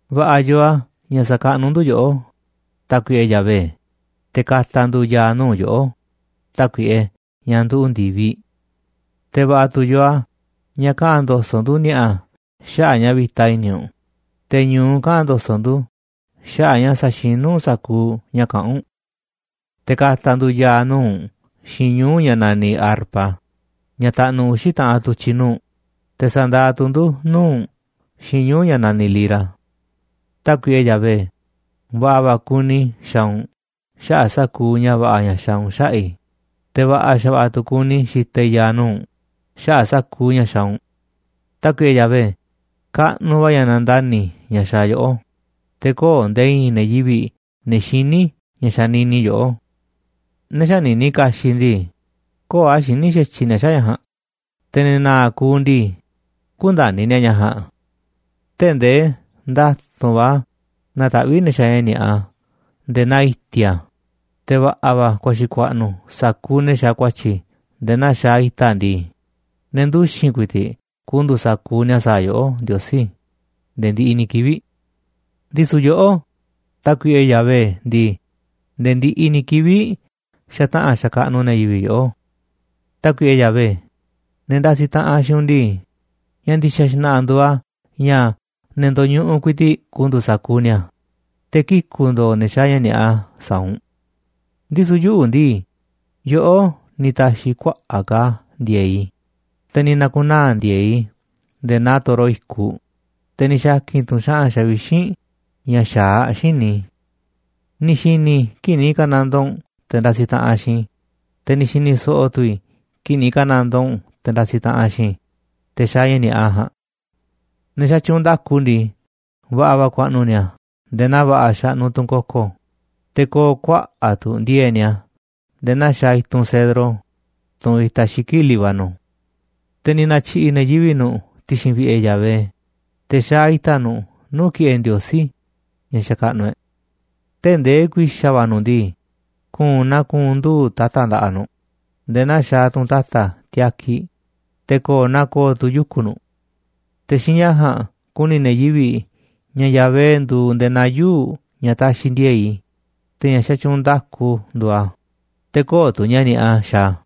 Va̱ꞌa̱ yoo a̱ ña̱ sa̱kaꞌnuꞌ ndu̱ yoꞌó, Tákuiꞌe Yahvé, te̱ ka̱ta̱ ndu̱ ya̱a̱ nuu̱ꞌ yoꞌó, Tákuiꞌe, ña̱ nduꞌu̱ ndi̱viꞌ. Te̱ va̱ꞌa̱ tu̱ yoo a̱ ña̱ kaꞌa̱n ndo̱so̱ꞌ ndu̱ ni̱a̱ꞌa̱ xaꞌa̱ꞌ ña̱ vi̱ta i̱ni̱ u̱nꞌ, te̱ ñu̱u kaꞌa̱n ndo̱so̱ꞌ ndu̱ xaꞌa̱ꞌ ña̱ saxinú u̱nꞌ sa̱kuuꞌ ña̱ kaꞌán u̱nꞌ. Te̱ ka̱ta̱ ndu̱ ya̱a̱ nuu̱ꞌ u̱nꞌ xiinꞌ ñuu̱ꞌ ña̱ naniꞌ arpa, ña̱ taꞌnuꞌ uxi̱ taꞌanꞌ tu̱tyi̱ nuu̱ꞌ, te̱ sa̱ndaaꞌ tu̱ ndu̱ nuu̱ꞌ u̱nꞌ xiinꞌ ñuu̱ꞌ ña̱ naniꞌ lira. Tákuiꞌe Yahvé, va̱ꞌa̱ va̱ kuni i̱ xaaꞌ u̱nꞌ xaꞌa̱ꞌ sa̱kuuꞌ ña̱ va̱ꞌa̱ ña̱ xaaꞌ u̱nꞌ xaꞌa̱ꞌ i̱, te̱ va̱ꞌa̱ xa̱va̱ꞌa̱ tu̱ kuni i̱ xitaꞌ i̱ ya̱a̱ nuu̱ꞌ u̱nꞌ xaꞌa̱ꞌ sa̱kuuꞌ ña̱ xaaꞌ u̱nꞌ. Tákuiꞌe Yahvé, kaꞌnuꞌ va̱ ña̱ nandani̱ ña̱ xaaꞌ yoꞌó, te̱ köo̱ꞌ nde̱e̱ i̱i̱n ne̱ yivi̱ꞌ, ne̱ xiní ña̱ xanini yoꞌó. Ne̱ xänini kaxiꞌ ndii, köo̱ꞌ a̱ xiní xa̱tyiꞌ ni̱a̱ xaꞌa̱ꞌ ña̱ ja̱a̱nꞌ, te̱ ne̱ na̱a̱ kuuꞌ ndii, kü̱nda̱ni̱ ni̱a̱ ña̱ ja̱a̱nꞌ. Tee̱ꞌ ndee nda̱tu̱nꞌ va̱ nataꞌvíꞌ ne̱ xaaꞌ ña̱ ni̱a̱ꞌa nde̱e̱ naa i̱ti̱a̱, te̱ va̱ꞌa̱ va̱ ku̱a̱xi̱ ku̱a̱ꞌnu̱ sa̱kuuꞌ ne̱ xaaꞌ ku̱a̱tyi̱ nde̱e̱ naa xaaꞌ i̱ta̱ ndii, ne̱ nduxi̱n ku̱i̱ti̱ꞌ ku̱ndu̱u̱ sa̱kuuꞌ ni̱a̱ sa̱a̱ yoꞌó, Ndiosí, nde̱e̱ ndiꞌiꞌ ni̱ kivi̱ꞌ. Ndisu̱ yoꞌó, Tákuiꞌe Yahvé ndii, nde̱e̱ ndiꞌiꞌ ni̱ kivi̱ꞌ xataꞌa̱n xakaꞌnuꞌ ne̱ yivi̱ꞌ yoꞌó. Tákuiꞌe Yahvé, ne̱ ndasiꞌ taꞌanꞌ xiinꞌ u̱nꞌ ndii, ña̱ ndi̱xa̱ xna̱ꞌa̱ nduuꞌ a̱ ña̱ ne̱ ndo̱ñuꞌuꞌ ku̱i̱ti̱ꞌ ku̱ndu̱u̱ sa̱kuuꞌ ni̱a̱, te̱ kiku̱ ndo̱o̱ ne̱ xaaꞌ ña̱ ni̱a̱ꞌa sa̱a̱ u̱nꞌ. Ndisu̱ yuꞌu̱ ndii, yoꞌó ni̱ ta̱xi̱ kuaꞌa̱ꞌ ka̱ ndi̱e̱e̱ꞌ i̱, te̱ ni̱ na̱ku̱naa̱ ndi̱e̱eꞌ i̱ nde̱e̱ naa toro i̱kuꞌ, te̱ ni̱ xa̱ki̱n tu̱ u̱nꞌ xa̱ꞌa̱n xavixínꞌ ña̱ xa̱aꞌ xíniꞌ i̱. Ni̱ xi̱ni̱ i̱ kii̱ꞌ ni̱ ka̱nandoo u̱nꞌ te̱ ndasiꞌ taꞌanꞌ xiinꞌ i̱, te̱ ni̱ xi̱ni̱ so̱ꞌo̱ tu̱ i̱ kii̱ꞌ ni̱ ka̱nandoo u̱nꞌ te̱ ndasiꞌ taꞌanꞌ xiinꞌ i̱, te̱ xaaꞌ ña̱ ni̱a̱ꞌa ja̱a̱nꞌ. Ne̱ xatyuunꞌ nda̱ku ndii, va̱ꞌa̱ va̱ ku̱a̱ꞌnu̱ ni̱a̱ nde̱e̱ naa va̱ꞌa̱ xaꞌnuꞌ tunꞌ koko, te̱ ko̱o̱ kuaꞌa̱ꞌ tu̱ ndi̱e̱e̱ꞌ ni̱a̱ nde̱e̱ naa xaaꞌ i̱tunꞌ cedro, tunꞌ itaꞌ xiki̱ꞌ Líbano. Te̱ ni̱ na̱tyi̱ꞌi̱ ne̱ yivi̱ꞌ nu̱ꞌ ti̱xi̱n vi̱ꞌe̱ Yahvé, te̱ xa̱a̱ i̱ta̱ nu̱ꞌ nuu̱ꞌ ki̱ꞌe̱ Ndiosí ña̱ xakaꞌnuꞌ e̱ꞌ. Tee̱ꞌ ndee ku̱i̱xa̱ va̱ nu̱ꞌ ndii, ku̱u̱n naa ku̱u̱n nduu̱ꞌ ta̱ta̱ nda̱ꞌaꞌ nu̱ꞌ, nde̱e̱ naa xaaꞌ tunꞌ ta̱ta̱ tiakiꞌ, te̱ ko̱o̱ naa ko̱o̱ tu̱ yuku̱ nu̱ꞌ. Te̱ xiinꞌ ña̱ ja̱a̱nꞌ ku̱ni̱ ne̱ yivi̱ꞌ ña̱ Yahvé nduuꞌ nde̱e̱ naa yuu̱ꞌ ña̱ taxiꞌ ndi̱e̱e̱ꞌ i̱, te̱ ña̱ xatyuunꞌ nda̱ku nduuꞌ a̱, te̱ köo̱ꞌ tu̱ ña̱ ni̱a̱ꞌa xaaꞌ a̱.